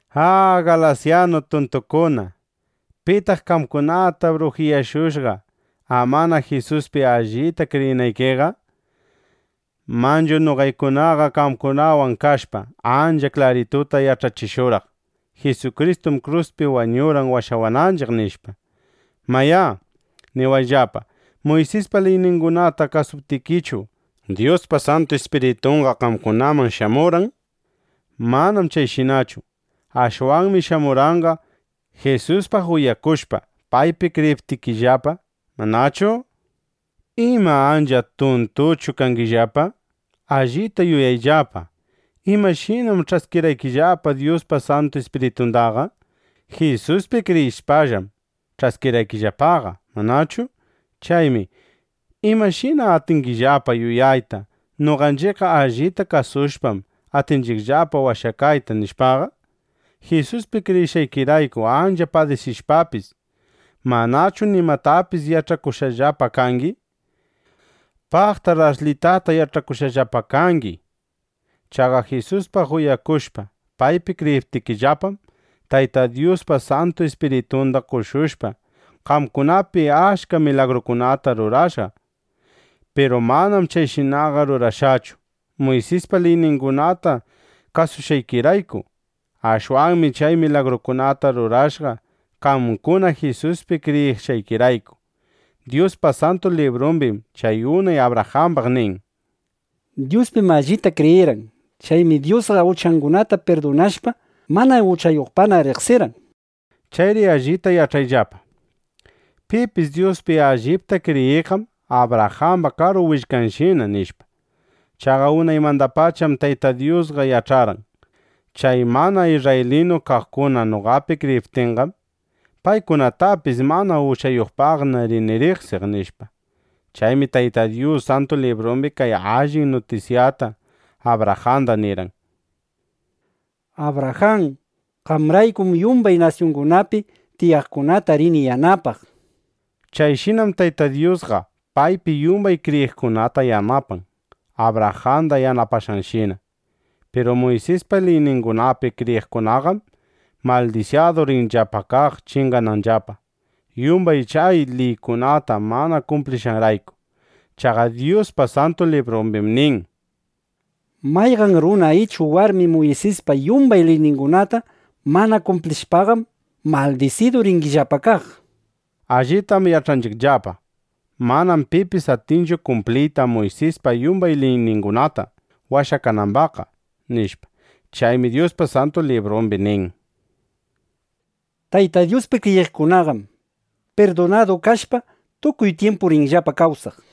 ¡A, galasyanu tuntukuna! ¿Pitaq qamkunata brujiyashushqa, amana Jisuspi allita kriyinaykiqa? Manchu noqaykunaqa qamkunawan kashpa, ancha klarituta yach'achishurqaq: “Jisukristum kruspi wañurqan washawananchiq”, nishpa. Mayá, niwayllapa, ¿Muysispa liyningunata kasuptikichu, Dyuspa Santu Ispiritunqa qamkunaman shamurqan? ¡Manam chayshinachu! Ashwanmi shamurqanqa, Jisuspaq uyakushpa, paypi kriyiptikillapa, ¿manachu? ¿Ima, ancha tuntuchu kangillapa? Allita yuyayllapa. ¿Imashinam ch'askirqaykillapa Dyuspa Santu Ispiritundaqa? Jisuspi kriyishpallam ch'askirqaykillapaqa, ¿manachu? Chaymi ¿imashina atingillapa yuyayta: Noqanchiqlla allita kawsashpam, atinchiqllapa washakayta, nishpaqa? Jisuspi kriyishqaykirayku ancha padisishpapis, ¿manachu nimatapis yach'akushqallapa kangi? ¡Paqtar ashlitata yach'akushqallapa kangi! Chaqa Jisuspaq uyakushpa, paypi kriyiptikillapam, Tayta Dyusqa Santu Ispiritunda qoshushpa, qamkunapi achka milagrukunata rurashqa. Piru manam chayshinaqa rurashqachu, Muysispa liyningunata kasushqaykirayku. Ashwanmi chay milagrukunata rurashqa, qamkuna Jisuspi kriyishqaykirayku. Dyuspa Santu Librumbim chay unay Abrajambaq nin: “Dyuspim allita kriyirqan. Chaymi Dyusqa uchangunata pirdunashpa, mana uchayuqpaqna riqsirqan”, nishpa. Chayri allita yach'ayllapa: Pipis Dyuspi allipta kriyiqqam Abrajamba karu willkanshina, nishpa. Chaqa unaymandapacham Tayta Dyusqa yach'arqan: Chay mana isrraylinu kaqkuna noqapi kriyiptinqam, paykunatapis mana uchayuqpaqna rini riqsiq, nishpa. Chaymi Tayta Dyus Santu Librumbi kay allin nutisyata Abrajanda nirqan: “Abrajan, qamraykum yumbay nasyungunapi tiyaqkunata rini yanapaq”, nishpa. Chayshinam Tayta Dyusqa paypi yumbay kriyiqkunata yanapan, Abrajanda yanapashqanshina. Piru Muysispa liyningunapi kriyiqkunaqam maldisidu rinllapa kaq chingananllapa, yumbay chay liykunata mana kumplishqanrayku. Chaqa Dyuspa Santu Librumbim nin: “Mayqan runa ichu warmi Muysispa yumbay liyningunata mana kumplishpaqam, maldisidu rinllapa kaq”, nishpa. Allitam yach'anchiqllapa: Manam pipis atinchu kumpliyta Muysispa yumbay liyningunata washakanambaqqa, nishpa. Chaymi Dyuspa Santu Librumbi nin: “Tayta Dyuspi kriyiqkunaqam pirdunadu kashpa, tukuy tyimpu rinllapa kawsaq”, nishpa.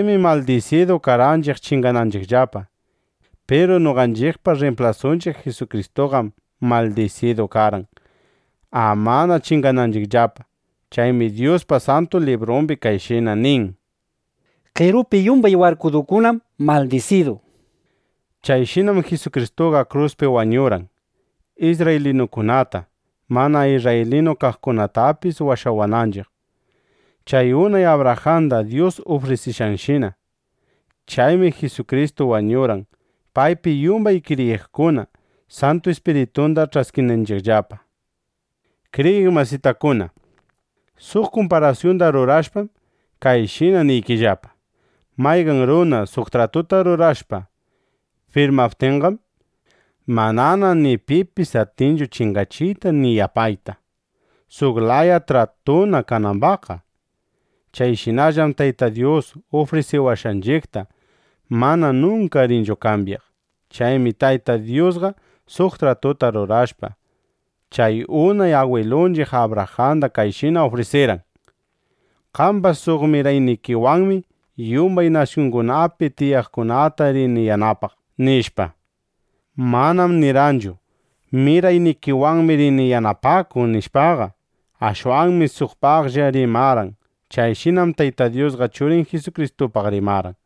Chaymi maldisidu karqanchiq chingananchiqllapa. Piru noqanchiqpa rrimplasunchiq Jisukristuqam maldisidu karqan, amana chingananchiqllapa. Chaymi Dyuspa Santu Librumbi kayshina nin: “Qerupi yumbay warkudukunam maldisidu”, nishpa. Chayshinam Jisukristuqa kruspi warkudu wañurqan, isrraylinukunata, mana isrraylinu kaqkunatapis washawananchiq, chay unay Abrajanda Dyus ufrisishqanshina. Chaymi Jisukristu wañurqan, paypi yumbay kriyiqkuna Santu Ispiritunda ch'askinanchiqllapa. Kriyiq masitakuna, suq kumparasyunda rurashpam, kayshina niykillapa: Mayqan runa suq tratuta rurashpa firmaptinqam, manana ni pipis atinchu chingachiyta ni yapayta, suq laya tratuna kanambaqqa. (Chayshinallam Tayta Dyus ufrisiwashqanchiqta mana nunka rinchu kambyaq.) Chaymi Tayta Dyusqa suq tratuta rurashpa, chay unay agwilunchiq Abrajanda kayshina ufrisirqan: “Qamba suq miraynikiwanmi yumbay nasyungunapi tiyaqkunata rini yanapaq”, nishpa. Manam nirqanchu: “Miraynikikunawanmi rini yanapakuq”, nishpaqa. Ashwanmi suqpaqlla rimarqan. Chayshinam Tayta Dyusqa Churin Jisukristupaq rimarqan.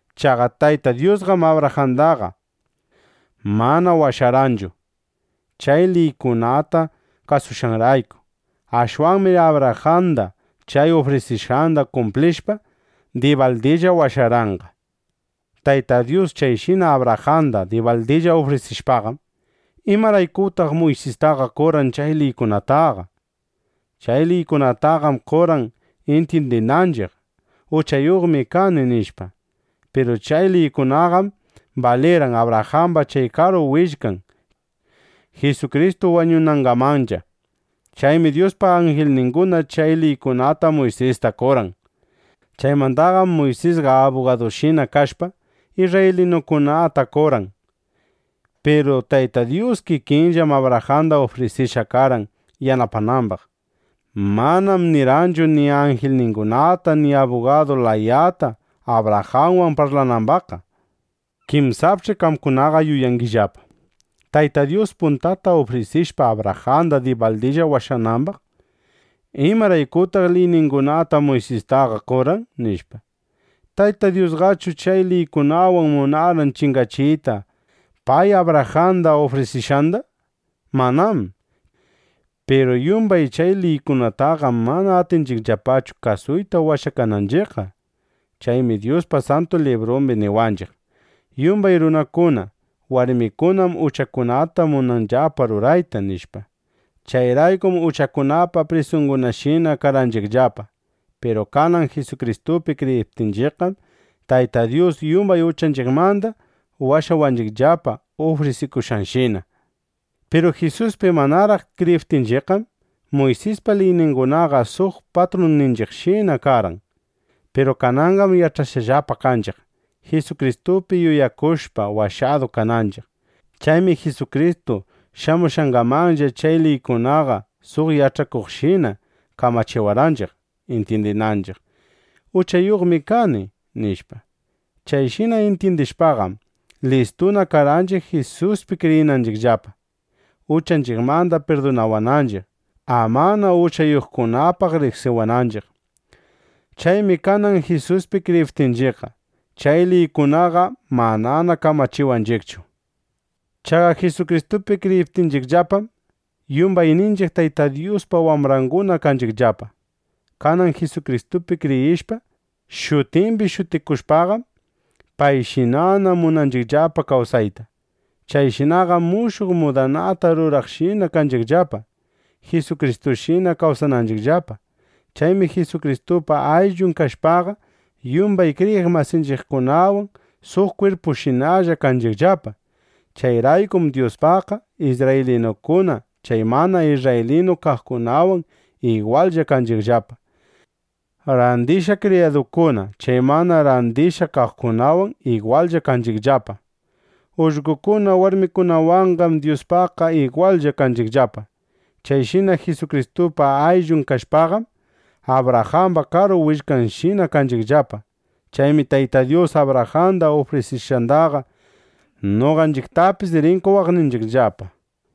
Chaqa Tayta Dyusqam Abrajandaqa mana washarqanchu, chay liykunata kasushqanrayku. Ashwanmi Abrajanda chay ufrisishqanda kumplishpa, dibaldilla washarqanqa. Tayta Dyus chayshina Abrajanda dibaldilla ufrisishpaqam, ¿imaraykutaq Muysistaqa qorqan chay liykunataqa? Chay liykunataqam qorqan, intyindinanchiq: Uchayuqmi kani nishpa. Piru chay liykunaqam balirqan Abrajamba chay karu willkan Jisukristu wañunangamanlla. Chaymi Dyuspa anjilninguna chay liykunata Muysista qorqan. Chaymandaqam Muysisqa abugadushina kashpa, isrraylinukunata qorqan. Piru Tayta Dyus kikinllam Abrajanda ufrisishqa karqan yanapanambaq. Manam nirqanchu ni anjilningunata ni abugadu layata, Abrajanwan parlanambaqqa. Kinsapch'i qamkunaqa yuyangillapa: Tayta Dyus puntata ufrisishpa Abrajanda dibaldilla washanambaq, ¿imaraykutaq liyningunata Muysistaqa qorqan? nishpa. ¿Tayta Dyusqachu chay liykunawan munarqan chingachiyta pay Abrajanda ufrisishqanda? ¡Manám! Piru yumbay chay liykunataqam mana atinchiqllapachu kasuyta washakananchiqqa. Chaymi Dyuspa Santu Librumbi niwanchiq: Yumbay runakuna, warmikunam uchakunata munanllapa rurayta, nishpa. Chayraykum uchakunapa prisungunashina karqanchiqllapa. Piru kanan Jisukristupi kriyiptinchiqqam, Tayta Dyus yumbay uchanchiqmanda washawanchiqllapa, ufrisikushqanshina. Piru Jisuspi manaraq kriyiptinchiqqam, Muysispa liyningunaqa suq patrunninchiqshina karqan. Piru kananqam yach'ashqallapa kanchiq, Jisukristupi yuyakushpa washadu kananchiq. Chaymi Jisukristu shamushqangamanlla chay liykunaqa suq yach'achikuqshina kamachiwarqanchiq, intyindinanchiq: Uchayuqmi kani, nishpa. Chayshina intyindishpaqam, listuna karqanchiq Jisuspi kriyinanchiqllapa, uchanchiqmanda pirdunawananchiq, amana uchayuqkunapaq riqsiwananchiq. Chaymi kanan Jisuspi kriyiptinchiqqa, chay liykunaqa manana kamachiwanchiqchu. Chaqa Jisukristupi kriyiptinchiqllapam, yumbayninchiq Tayta Dyuspa wambrangunana kanchiqllapa. Kanan Jisukristupi kriyishpa, shutimbi shutikushpaqam, payshinana munanchiqllapa kawsayta. Chayshinaqam mushuq mudanata rurakuqshina kanchiqllapa, Jisukristushina kawsananchiqllapa. Chaymi Jisukristupa ayllun kashpaqa, yumbay kriyiq masinchiqkunawan suq kwirpushinallana kanchiqllapa. Chayraykum Dyuspaqqa isrraylinukuna chay mana isrraylinu kaqkunawan igwallla kanchiqllapa; randishqa kriyadukuna chay mana randishqa kaqkunawan igwallla kanchiqllapa; ullqokuna warmikunawanqam Dyuspaqqa igwallla kanchiqllapa. Chayshina Jisukristupa ayllun kashpaqam, Abrajamba karu willkanshinana kanchiqllapa. Chaymi Tayta Dyus Abrajanda ufrisishqandaqa, noqanchiqtapis rin qowaqninchiqllapa.